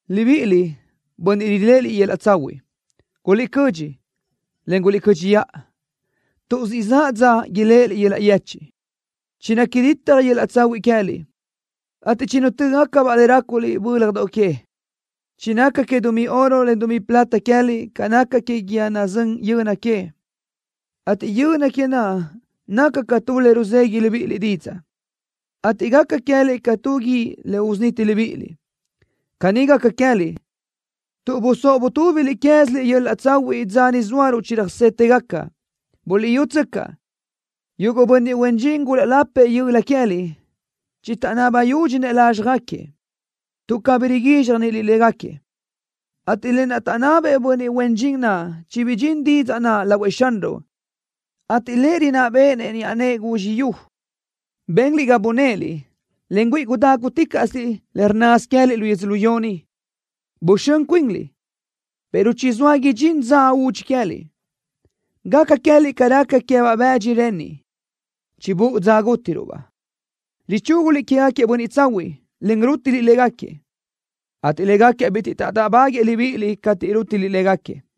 Libíʼiliʼ, bönniʼ riléʼeliʼ yöl-laʼ tsahuiʼ, guliʼcödxi, en guliʼcö́dxiʼa, tuʼ siʼ zaʼ dza iléʼeliʼ yöl-laʼ yechiʼ. Chinaca ditaj yöl-laʼ tsahuiʼ queë́liʼ, ateʼ chinutö́gacabaʼ le ráculiʼ bö́ljadoʼ que. Chinaca que dumí oro, en dumí plata queë́liʼ ca naca que guíë nazö́n yöni que, ateʼ yöni que naʼ naca ca tu le ruzegui libíʼiliʼ didzaʼ, ateʼ gaca queë́liʼ ca tu guíʼ le usuniti libíʼiliʼ. Caní gaca queë́liʼ, tuʼ busóʼ butúbiliʼ queë́ziliʼ yöl-laʼ tsahuiʼ dza ni zóaruʼ chiröjsétëgaca. ¡Buliʼyútsöcaʼ! Yuguʼ bönniʼ huen dxin gulaʼlapëʼ yöla queë́liʼ chitaʼnaba yúdxinëʼ lázxjagaquiëʼ, tuʼ cabí riguízxjaniliʼ légaquiëʼ, ateʼ lë naʼ taʼnabëʼ bönniʼ huen dxin naʼ chibidxín didzaʼ naʼ lahuëʼ Xanruʼ, ateʼ Lëʼ rinná béʼenëʼ niʼa nëʼë guizxi yu. Benliʼ ga bunéʼeliʼ, en güíʼi gudáguticaʼsiliʼ le rnnasö queë́liʼ lu yödzölió ni. Buxö́n cuinliʼ, pero chizóa idxín dza údxi queë́liʼ. Gaca queë́liʼ ca raca queë́baʼ bëdxi renniʼ, chibúʼu dza gútiruʼ-baʼ. Richúguliʼ quégaquiëʼ bönniʼ tsahuiʼ, en rútiliʼ légaquiëʼ, ateʼ légaquiëʼ bitiʼ taʼdáʼbaguëʼë libíʼiliʼ cateʼ rútiliʼ légaquiëʼ.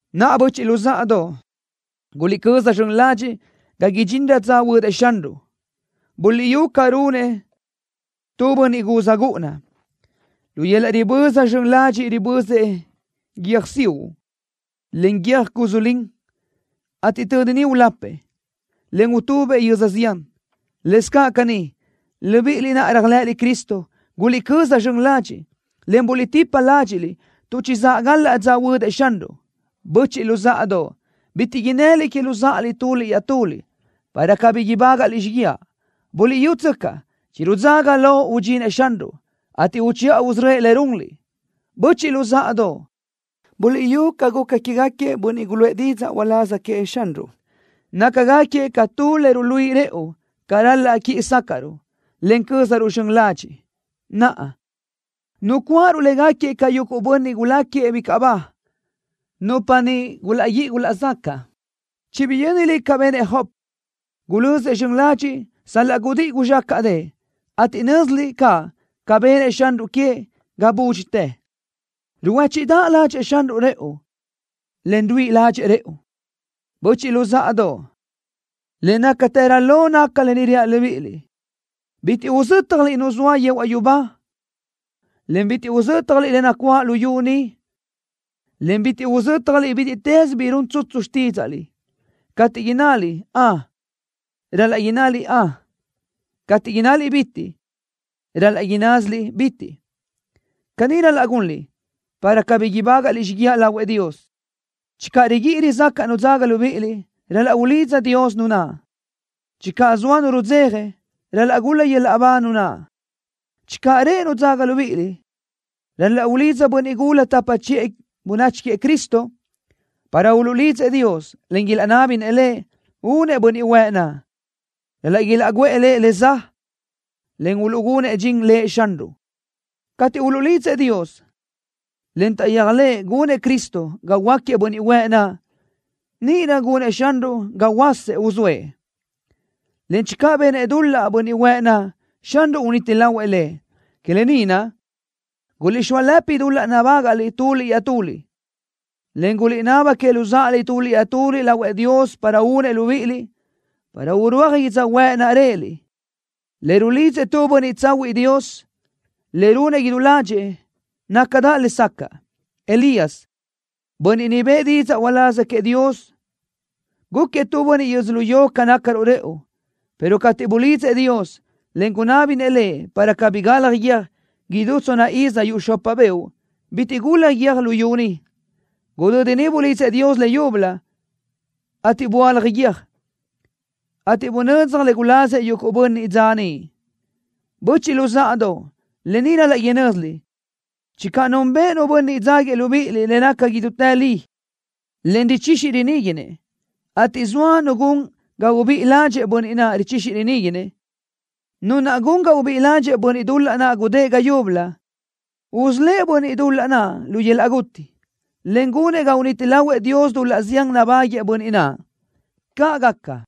Naʼa, böchiʼ luzáʼadoʼ, guliʼcöza zxön ladxiʼ ga idxinrö dza huödëʼ Xanruʼ. Buliʼyú ca runëʼ tu bönniʼ guz gúʼuna. Lu yöl-laʼ riböza zxön ladxiʼ ribözëʼ guiö́jsiuʼ, en guiö́j cusu lin, ateʼ tödi niʼ ulapëʼ, en utubëʼ yöz zián. Lëscaʼ caní, libíʼiliʼ naʼ réajlëʼëliʼ Cristo, guliʼcöza zxön ladxiʼ, en buliʼtipa ládxiʼliʼ, tuʼ chizáʼ galaʼ dza huödëʼ Xanruʼ. Böchiʼ luzáʼadoʼ, bitiʼ innëliʼ que luzáʼaliʼ tuliʼ iaʼtuliʼ, para cabí ibágaʼliʼ xíguiaʼ. ¡Buliʼyútsöcaʼ! ¡Chirudzaga lo udxinëʼ Xanruʼ, ateʼ uchiʼa usörö́ëʼ le runliʼ! Böchiʼ luzáʼadoʼ, buliʼyú ca guca quégaquiëʼ bönniʼ guluʼë didzaʼ uláz queëʼ Xanruʼ. Nácagaquiëʼ ca tu le ruluíʼi rëʼu ca ral-laʼ quíʼi sácaʼruʼ, en cö́zaruʼ zxön ladxiʼ. Naʼa, nucuáʼaruʼ légaquiëʼ ca yuguʼ bönniʼ guláquiëʼ bicaʼ ba, nupa niʼ gulaʼguíʼi gulaʼzacaʼ. Chibiyö́niliʼ ca benëʼ Job. Gulözëʼ zxön ladxiʼ sal-laʼ gudíʼi guzxácaʼdëʼë, ateʼ nö́ziliʼ caʼ ca benëʼ Xanruʼ queëʼ ga búdxitë. Ruhuéchiʼdaʼ ládxëʼë Xanruʼ rëʼu, en ruíʼi ládxëʼë rëʼu. Böchiʼ luzáʼadoʼ, le nácatërö lo naca lë ni reaʼ libíʼiliʼ: ¡Bitiʼ uzö́tjaliʼ Nu zoa yehuaʼ yubá, en bitiʼ uzö́tjaliʼ le nacuáʼ luyú ni, en bitiʼ uzö́tjaliʼ bítiʼtës bi run tsutsu xtídzaʼliʼ! Cateʼ innaliʼ “Ön” ral-laʼ innásiliʼ “Ön.” Cateʼ innaliʼ “Bitiʼ” ral-laʼ innásiliʼ “Bitiʼ.” Caní ral-laʼ gunliʼ, para cabí ibágaʼliʼ xíguiaʼ lahuëʼ Dios. Channö riguíʼi rizácaʼ nu dzaga libíʼiliʼ, ral-laʼ ulidza Dios nu naʼ. Channö zoa nu rudzeja, ral-laʼ gul-la yöl-laʼ ba nu naʼ. Channö reʼe nu dzaga libíʼiliʼ, ral-laʼ ulidza bönniʼ gula tapa chiʼë bönachi queëʼ Cristo, para uluʼlidzëʼ Dios, en ilaʼnábinëʼ Lëʼ únëʼ bönniʼ huëʼ naʼ. Ral-laʼ ilaʼguʼë lëʼ le za, en uluʼgunëʼ dxin Lëʼ Xanruʼ. Cateʼ uluʼlidzëʼ Dios, en taʼyéajlëʼë gunëʼ Cristo ga huöáquiëʼ bönniʼ huëʼ naʼ, níʼirö gunëʼ Xanruʼ ga huöása uzóëʼ, en channö benëʼ dul-laʼ bönniʼ huëʼ naʼ, Xanruʼ uniti lahuëʼ lëʼ. Que lë ni naʼ, guliʼxóalëpi dul-laʼ nabágaʼliʼ tuliʼ iaʼtuliʼ, en guliʼnaba que luzáʼaliʼ tuliʼ iaʼtuliʼ lahuëʼ Dios para únëʼ libíʼiliʼ, para urúaj yödzöhuë́ʼ naʼ réʼeliʼ. Le rulidzëʼ tu bönniʼ tsahuiʼ Dios, le runëʼ idú ládxëʼë, nácadaʼ lesacaʼ. Elías, bönniʼ niʼ bëʼë didzaʼ uláz queëʼ Dios, gúquiëʼ tu bönniʼ yödzölió ca nácaruʼ rëʼu, pero cateʼ bulidzëʼ Dios, en gunábinëʼ Lëʼ para cabí galaj guiö́j, idú tsonna iz yuʼ xopa beoʼ bitiʼ gulaj guiö́j luyú ni. Gudödi niʼ bulidzëʼ Dios leyúbölö, ateʼ böálaj guiö́j, ateʼ bunödzaj le gulazëʼ yuguʼ bönniʼ dza niʼ. Böchiʼ luzáʼadoʼ, lë ni ral-laʼ inö́ziliʼ. Channö nunbëʼ nu bönniʼ dzáguiëʼ libíʼiliʼ le naca idútë li, en richixi riníguinëʼ, ateʼ zoa nu gun ga ubíʼi ládxëʼë bönniʼ naʼ richixi riníguinëʼ, nu naʼ gun ga ubíʼi ládxëʼë bönniʼ dul-laʼ naʼ gudë́ʼ ga yúbölö, usölë́ʼ bönniʼ dul-laʼ naʼ lu yöl-laʼ guti, en gunëʼ ga uniti lahuëʼ Dios dul-laʼ zián nabáguëʼë bönniʼ naʼ. ¡Caʼ gaca!